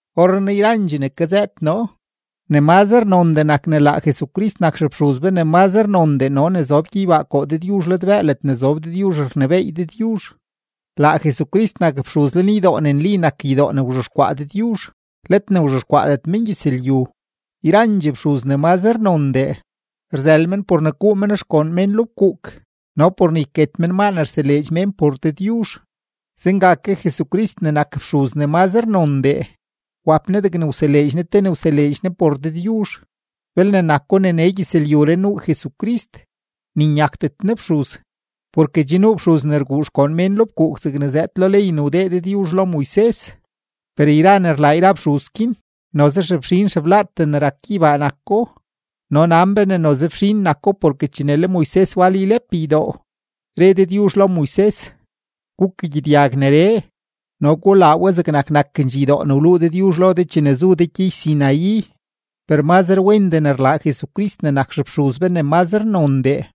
Orrenaa yrandxee ne kazëët noo, ne mazre nondee nak ne laa Jesucrist nak xefxuz be ne mazre nondee no ne zob gyeybaa koo Dëdyuzh ladbëë ledne zob Dëdyuzh rnebééy Dëdyuzh. Laa Jesucrist nak fxuz lenydoo ne nli nak ydoo ne wzhexkwaa Dëdyuzh, let ne wzhexkwaadet mengyëzlyu. Yrandxee fxuz ne mazre nondee, rzël men por ne guu men xgoon mén lo fkuuk no por ne yket men maa ne rseleedx mén por Dëdyuzh, zenga ke Jesucrist ne nak fxuz ne mazre nondee, wap Ne degne wseleedx Ne te ne wseleedx Ne por Dëdyuzh. Belne nako ne nee gyëzlyuree nuu Jesucrist, ni nyakdet Ne fxuz, porke che nuu fxuz ne rguu xgoon mén lo fkuuk zegne zëëd lo ley ne wdee Dëdyuzh lo Moises. Per yra ne rlaa yra fxuz guin, noze xefxin xeblaatee ne rak gyeybaa nako, no nan be ne noze fxin nako porke chene le Moises wal ylep ydoo, re Dëdyuzh lo Moises: “Gukagyedyag neree no gulaa we zegnak nakendxee ydoo ne wluu noo lo de chene zu de gyey-Sinaí.” Per mazre wendee ne rlaa Jesucrist ne nak xefxuz be ne mazre nondee,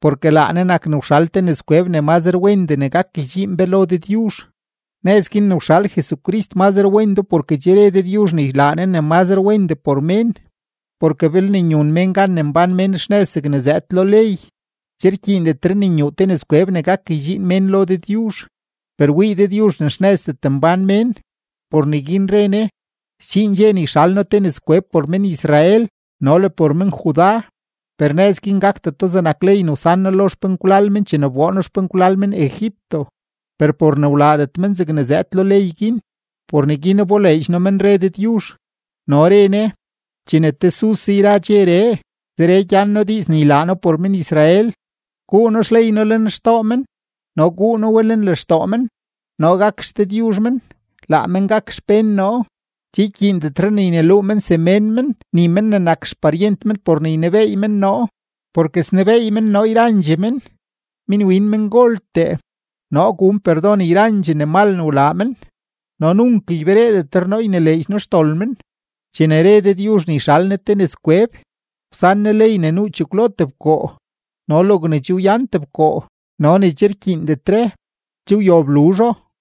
porke laa Ne nak ne wxal te nëzkweb ne mazre wendee ne gak ydxiin be lo Dëdyuzh; nëz guin ne wxal Jesucrist mazre wendoo porke che re Dëdyuzh ne ylaa Ne ne mazre wendee por mén. Porke belne nyun mén gan ne mbán men xnëz zegne zëëd lo ley, che rkyiindetre ne nyuu te nëzkweb ne gak ydxiin mén lo Dëdyuzh. Per wii Dëdyuzh ne xnëzdet mbán mén, por neguin re Ne: Sdxiin dxe ne yxal noo te nëzkweb por men-Israel no le por men-Judá. Per nëz guin gakdeto zegnak ley ne wsan noo lo xpenkwlal men chene wboo noo xpenkwlal men Egipto; per por ne wlaadet men zegne zëëd lo ley guin, por neguin wboleedx noo men, re Dëdyuzh. No re Ne: Chene tesuse yra dxeree, zeree gyan noo diiz ne ylaa noo por men-Israel: Guu noo xley noo lenxtoo men no guu noo we lenlextoo men. Noo gak XDëdyuzh men, laa men gak xpén noo. Che ykyiindetre ne yneluu men semén men ni men ne nak xparyent men por ne ynebeey men noo, porke snebeey men noo yrandxee men, minwin mengoltee. Noo gun perdon yrandxee ne mal ne wlaa men, no nunk ybereedetre noo ynileedx noo xdol men. Chene re Dëdyuzh ne yxal Ne te nëzkweb, wsan Ne ley ne nuu chekwlo tebkoo; no logne che wyan tebkoo no ne che rkyiindetre, che wyob luzho.